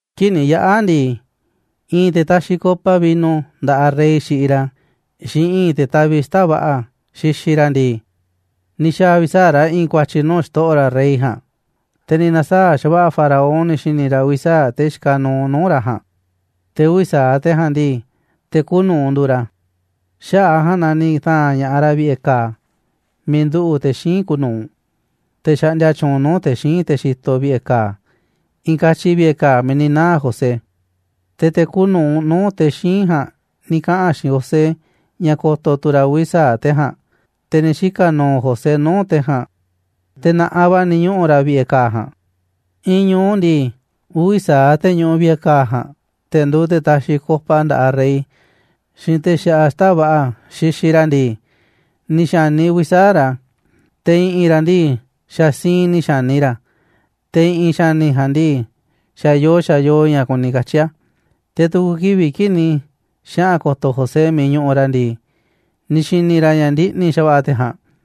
Kii̱ꞌ ni̱ yaꞌa̱ ndii, i̱i̱n te̱ taxiꞌ copa vino nda̱ꞌaꞌ rey xiꞌiꞌ ra̱, xiinꞌ i̱i̱n te̱ taviꞌ xita̱ꞌ va̱ꞌa̱ xixiꞌ ra̱ ndii, ni̱ xa̱a̱ uvi̱ sa̱aꞌ ra̱ i̱i̱n ku̱a̱tyi̱ nuu̱ꞌ xto̱ꞌo̱ ra̱ rey ja̱a̱nꞌ. Te̱ ni̱ na̱saa̱ꞌ xa̱va̱ꞌa̱ Faraón ni̱ xi̱ni̱ ra̱ uvi̱ sa̱aꞌ te̱ xikaꞌ nuuꞌ nuu̱ꞌ ra̱ ja̱a̱nꞌ, te̱ uvi̱ sa̱aꞌ te̱ ja̱a̱nꞌ ndii, te̱ kuuꞌ nuu̱ꞌ nduuꞌ ra̱. Xaꞌa̱ꞌ a̱ ja̱a̱nꞌ na ni̱ ta̱a̱nꞌ ña̱ꞌaꞌ ra̱ vi̱ꞌe̱ ka̱a̱ miiꞌ nduꞌu̱ꞌ te̱ xíinꞌ kuuꞌ nu̱uꞌ, te̱ xaꞌndia tyuunꞌ nuu̱ꞌ te̱ xíinꞌ te̱ xitoꞌ vi̱ꞌe̱ ka̱a̱, i̱i̱n katyi vi̱ꞌe̱ ka̱a̱ miiꞌ ni̱ naa̱ José. Te̱ te̱ kuuꞌ nu̱uꞌ nuu̱ꞌ te̱ xíinꞌ ja̱a̱nꞌ ni̱ kaꞌa̱n xiinꞌ José ña̱ ko̱to̱ tu̱ ra̱ uvi̱ sa̱aꞌ te̱ ja̱a̱nꞌ, te̱ ni̱ xika̱ nu̱u̱ José nuu̱ꞌ te̱ ja̱a̱nꞌ, te̱ na̱ꞌanꞌ va̱ ni̱ ñuꞌu̱ ra̱ vi̱ꞌe̱ ka̱a̱ ja̱a̱nꞌ. I̱i̱n ñu̱u ndii, uvi̱ sa̱aꞌ te̱ ñuꞌuꞌ vi̱ꞌe̱ ka̱a̱ ja̱a̱nꞌ, te̱ nduuꞌ te̱ taxiꞌ copa nda̱ꞌaꞌ rey, xiinꞌ te̱ xaꞌa xita̱ꞌ va̱ꞌa̱ xixiꞌ ra̱ ndii, ni̱ xa̱ni uvi̱ sa̱aꞌ ra̱, te̱ i̱ꞌi̱n ra̱ ndii, xa̱ siinꞌ ni̱ xa̱ni ra̱, te̱ i̱ꞌi̱n xa̱ni̱ ja̱a̱nꞌ ndii, xa̱ yoo xa̱ yoo ña̱ kuni katyi̱ a̱. Te̱ tu̱ku̱ kivi̱ꞌ kii̱ꞌ ni̱ xaꞌa̱n ko̱to̱ José miiꞌ ñuꞌuꞌ ra̱ ndii, ni̱ xi̱ni̱ ra̱ ña̱ ndiꞌni̱ xa̱va̱ꞌa̱ te̱ ja̱a̱nꞌ,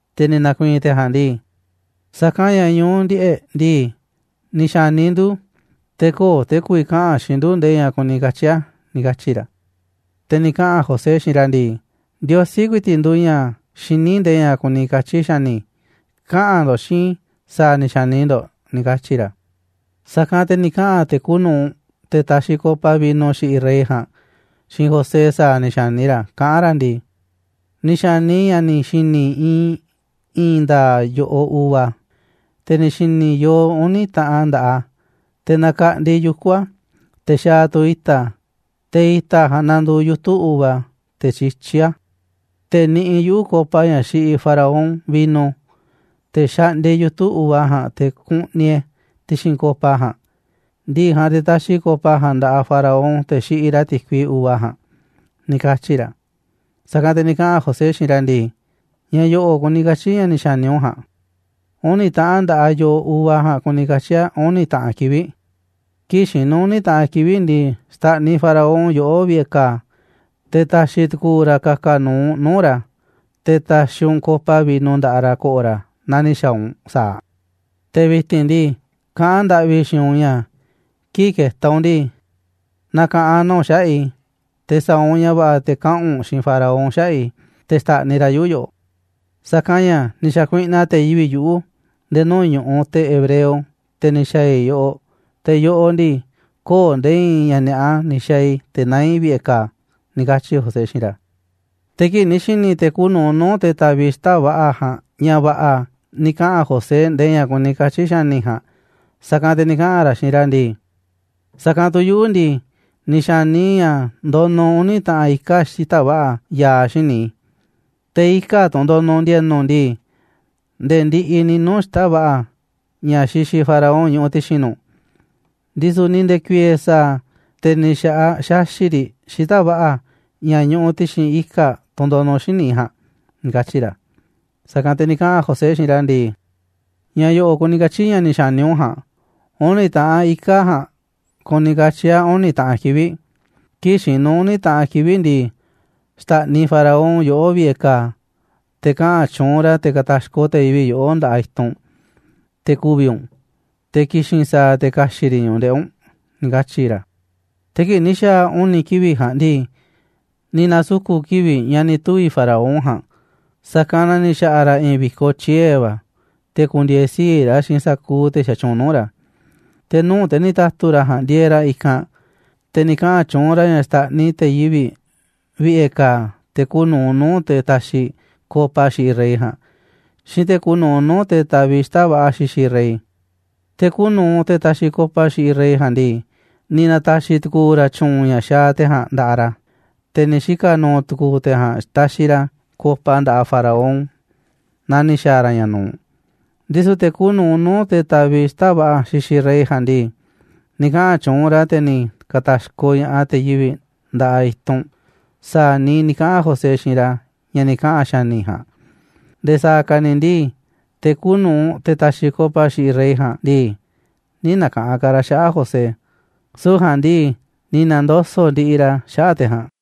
Te̱ ni̱ na̱ku̱i̱i̱n te̱ ja̱a̱nꞌ ndii: ―Sa̱kanꞌ ña̱ ñu̱u ndiꞌe̱ꞌ ndii, ni̱ xa̱ni ndu̱, te̱ köo̱ꞌ te̱ ku̱vi̱ kaꞌa̱n xiinꞌ ndu̱ nde̱e̱ ña̱ kuni katyi̱ a̱ ―ni̱ katyi̱ ra̱. Te̱ ni̱ kaꞌa̱n José xiinꞌ ra̱ ndii: ―Ndiosí ku̱i̱ti̱ꞌ nduuꞌ ña̱ xiní nde̱e̱ ña̱ kuni katyi̱ xa̱ni̱. Kaꞌa̱n ndo̱ꞌ xiinꞌ i̱ sa̱a̱ ni̱ xa̱ni ndo̱ꞌ ―ni̱ katyi̱ ra̱. Sa̱kanꞌ te̱ ni̱ kaꞌa̱n te̱ kuuꞌ nu̱uꞌ, te̱ taxiꞌ copa vino xiꞌiꞌ rey ja̱a̱nꞌ, xiinꞌ José sa̱a̱ ni̱ xa̱ni ra̱, kaꞌán ra̱ ndii: ―Ni̱ xa̱ni i̱ ña̱ ni̱ xi̱ni̱ i̱ iinꞌ i̱i̱n nda̱a̱ꞌ yo̱ꞌoꞌ uva, te̱ ni̱ xi̱ni̱ i̱ yoo uni̱ taꞌan nda̱ꞌaꞌ a̱, te̱ nakaꞌndi yuku̱ a̱, te̱ xaaꞌ tu̱ i̱ta̱ a̱, te̱ i̱ta̱ a̱ ja̱a̱nꞌ nanduuꞌ yutu̱ uva, te̱ tyityí a̱. Te̱ niꞌiꞌ yuꞌu̱ copa, ña̱ xiꞌiꞌ Faraón vino, te̱ xaꞌndia i̱ yutu̱ uva ja̱a̱nꞌ te̱ kuꞌniꞌ e̱ a̱ ti̱xi̱n copa ja̱a̱nꞌ. Ndi̱ꞌi̱ ja̱a̱nꞌ, te̱ taxiꞌ i̱ copa ja̱a̱nꞌ nda̱ꞌaꞌ Faraón, te̱ xiꞌiꞌ ra̱ ti̱kui uva ja̱a̱nꞌ ―ni̱ katyi̱ ra̱. Sa̱kanꞌ te̱ ni̱ kaꞌa̱n José xiinꞌ ra̱ ndii: ―Ña̱ yo̱ꞌo̱ kuni katyi̱ ña̱ ni̱ xa̱ni u̱nꞌ ja̱a̱nꞌ: Uni̱ taꞌan nda̱ꞌaꞌ yo̱ꞌoꞌ ja̱a̱nꞌ kuni katyi̱ a̱ uni̱ taꞌan kivi̱ꞌ. Kii̱ꞌ xinu̱ uni̱ taꞌan kivi̱ꞌ ndii, xta̱ꞌniꞌ Faraón yoꞌó vi̱ꞌe̱ ka̱a̱, te̱ ta̱xi̱ tu̱ku̱u̱ ra̱ ka̱ka̱ nu̱u̱ u̱nꞌ nuu̱ꞌ ra̱, te̱ ta̱xi̱ u̱nꞌ copa vino nda̱ꞌaꞌ ra̱ ko̱ꞌo̱ ra̱ naa ni̱ xa̱a̱ u̱nꞌ sa̱aꞌ. Te̱ vi̱ti̱n ndii, kaꞌán ndaꞌvi i̱ xiinꞌ u̱nꞌ ña̱ kii̱ꞌ ke̱ta̱ u̱nꞌ ndii, na̱ka̱ꞌanꞌ na u̱nꞌ xaꞌa̱ꞌ i̱, te̱ sa̱a̱ u̱nꞌ ña̱ va̱ꞌa̱ te̱ kaꞌa̱n u̱nꞌ xiinꞌ Faraón xaꞌa̱ꞌ i̱, te̱ xta̱ꞌniꞌ ra̱ yuꞌu̱ yoꞌoꞌ. Sa̱kanꞌ ña̱ ni̱ xa̱kuiꞌnaꞌ te̱ yivi̱ꞌ yuꞌu̱ nde̱e̱ nuu̱ꞌ ñu̱ꞌuꞌ te̱ hebreo, te̱ ni̱ xa̱a̱ i̱ yoꞌoꞌ, te̱ yoꞌoꞌ ndii, köo̱ꞌ nde̱e̱ i̱i̱n ña̱ ni̱a̱ꞌa ni̱ xa̱a̱ i̱ te̱ naá i̱ vi̱ꞌe̱ ka̱a̱ ―ni̱ katyi̱ José xiinꞌ ra̱. Te̱ kii̱ꞌ ni̱ xi̱ni̱ te̱ kuuꞌ nu̱uꞌ nuu̱ꞌ te̱ taviꞌ xita̱ꞌ va̱ꞌa̱ ja̱a̱nꞌ ña̱ va̱ꞌa̱ ni̱ kaꞌa̱n José nde̱e̱ ña̱ kuni katyi̱ xa̱ni̱ ja̱a̱nꞌ, sa̱kanꞌ te̱ ni̱ kaꞌa̱n ra̱ xiinꞌ ra̱ ndii: ―Sa̱kanꞌ tu̱ yuꞌu̱ ndii, ni̱ xa̱ni i̱ ña̱ ndonuꞌ uni̱ taꞌan ika̱ꞌ xita̱ꞌ va̱ꞌa̱ ya̱a̱ xíniꞌ i̱. Te̱ ika̱ꞌ tunꞌ ndonuꞌ ndi̱e̱nu̱ ndii, nde̱e̱ ndiꞌiꞌ ni̱ nuu̱ꞌ xita̱ꞌ va̱ꞌa̱ ña̱ xixiꞌ Faraón ñuꞌuꞌ ti̱xi̱n nu̱ꞌ, ndisu̱ ni̱ nde̱ku̱i̱e̱e̱ sa̱a̱, te̱ ni̱ xa̱ꞌaꞌ xaxi̱ꞌ riꞌ xita̱ꞌ va̱ꞌa̱ ña̱ ñuꞌuꞌ ti̱xi̱n ika̱ꞌ tunꞌ ndonuꞌ xíniꞌ i̱ ja̱a̱nꞌ ―ni̱ katyi̱ ra̱. Sa̱kanꞌ te̱ ni̱ kaꞌa̱n José xiinꞌ ra̱ ndii: ―Ña̱ yo̱ꞌo̱ kuni katyi̱ ña̱ ni̱ xa̱ni u̱nꞌ ja̱a̱nꞌ: Uni̱ taꞌan ika̱ꞌ ja̱a̱nꞌ kuni katyi̱ a̱ uni̱ taꞌan kivi̱ꞌ. Kii̱ꞌ xinu̱ uni̱ taꞌan kivi̱ꞌ ndii, xta̱ꞌniꞌ Faraón yoꞌó vi̱ꞌe̱ ka̱a̱, te̱ kaꞌa̱n tyuunꞌ ra̱ te̱ ka̱ta̱xkoꞌ te̱ yivi̱ꞌ yoꞌó nda̱ꞌaꞌ i̱tunꞌ, te̱ ku̱vi̱ u̱nꞌ, te̱ ki̱xi̱n sa̱a̱ te̱ ka̱xi̱ꞌ riꞌ ñu̱ꞌuꞌ ndeꞌi̱ u̱nꞌ ―ni̱ katyi̱ ra̱. Te̱ kii̱ꞌ ni̱ xa̱a̱ uni̱ kivi̱ꞌ ja̱a̱nꞌ ndii, ni̱ na̱suku̱ kivi̱ꞌ ña̱ ni̱ tuvi̱ Faraón ja̱a̱nꞌ, sa̱kanꞌ na ni̱ xa̱ꞌa̱ ra̱ i̱i̱n vi̱koꞌ tyie̱ va̱, te̱ ku̱ndi̱e̱e̱ sii̱ꞌ ra̱ xiinꞌ sa̱kuuꞌ te̱ xatyuunꞌ nuu̱ꞌ ra̱. Te̱ nuu̱ꞌ te̱ ni̱ ta̱tu̱ ra̱ ja̱a̱nꞌ ndieeꞌ ra̱ i̱kanꞌ, te̱ ni̱ kaꞌa̱n tyuunꞌ ra̱ ña̱ xta̱ꞌniꞌ te̱ yivi̱ꞌ vi̱ꞌe̱ ka̱a̱, te̱ kuuꞌ nu̱uꞌ nuu̱ꞌ te̱ taxiꞌ copa xiꞌiꞌ rey ja̱a̱nꞌ, xiinꞌ te̱ kuuꞌ nu̱uꞌ nuu̱ꞌ te̱ taviꞌ xita̱ꞌ va̱ꞌa̱ xixiꞌ rey. Te̱ kuuꞌ nu̱uꞌ te̱ taxiꞌ copa xiꞌiꞌ rey ja̱a̱nꞌ ndii, ni̱ na̱ta̱xi̱ tu̱ku̱u̱ ra̱ tyu̱u̱n ña̱ xaaꞌ te̱ ja̱a̱nꞌ nda̱ꞌaꞌ ra̱, te̱ ni̱ xika̱ nu̱u̱ tu̱ku̱u̱ te̱ ja̱a̱nꞌ taxiꞌ ra̱ copa nda̱ꞌaꞌ Faraón naa ni̱ xa̱a̱ ra̱ ña̱ nu̱uꞌ. Ndisu̱ te̱ kuuꞌ nu̱uꞌ nuu̱ꞌ te̱ taviꞌ xita̱ꞌ va̱ꞌa̱ xixiꞌ rey ja̱a̱nꞌ ndii, ni̱ kaꞌa̱n tyuunꞌ ra̱, te̱ ni̱ ka̱ta̱xkoꞌ ña̱ꞌaꞌ te̱ yivi̱ꞌ nda̱ꞌaꞌ i̱tunꞌ sa̱a̱ niiꞌ ni̱ kaꞌa̱n José xiinꞌ ra̱ ña̱ ni̱ kaꞌa̱n xa̱ni̱ ja̱a̱nꞌ. Nde̱e̱ sa̱a̱ ka̱ ni̱ ndii, te̱ kuuꞌ nu̱uꞌ, te̱ taxiꞌ copa xiꞌiꞌ rey ja̱a̱nꞌ ndii, nï̱ na̱ka̱ꞌanꞌ ka̱ ra̱ xaꞌa̱ꞌ José, süu̱ꞌ ja̱a̱nꞌ ndii, ni̱ na̱ndoso̱ꞌ ndiꞌiꞌ ra̱ xaꞌa̱ꞌ te̱ ja̱a̱nꞌ.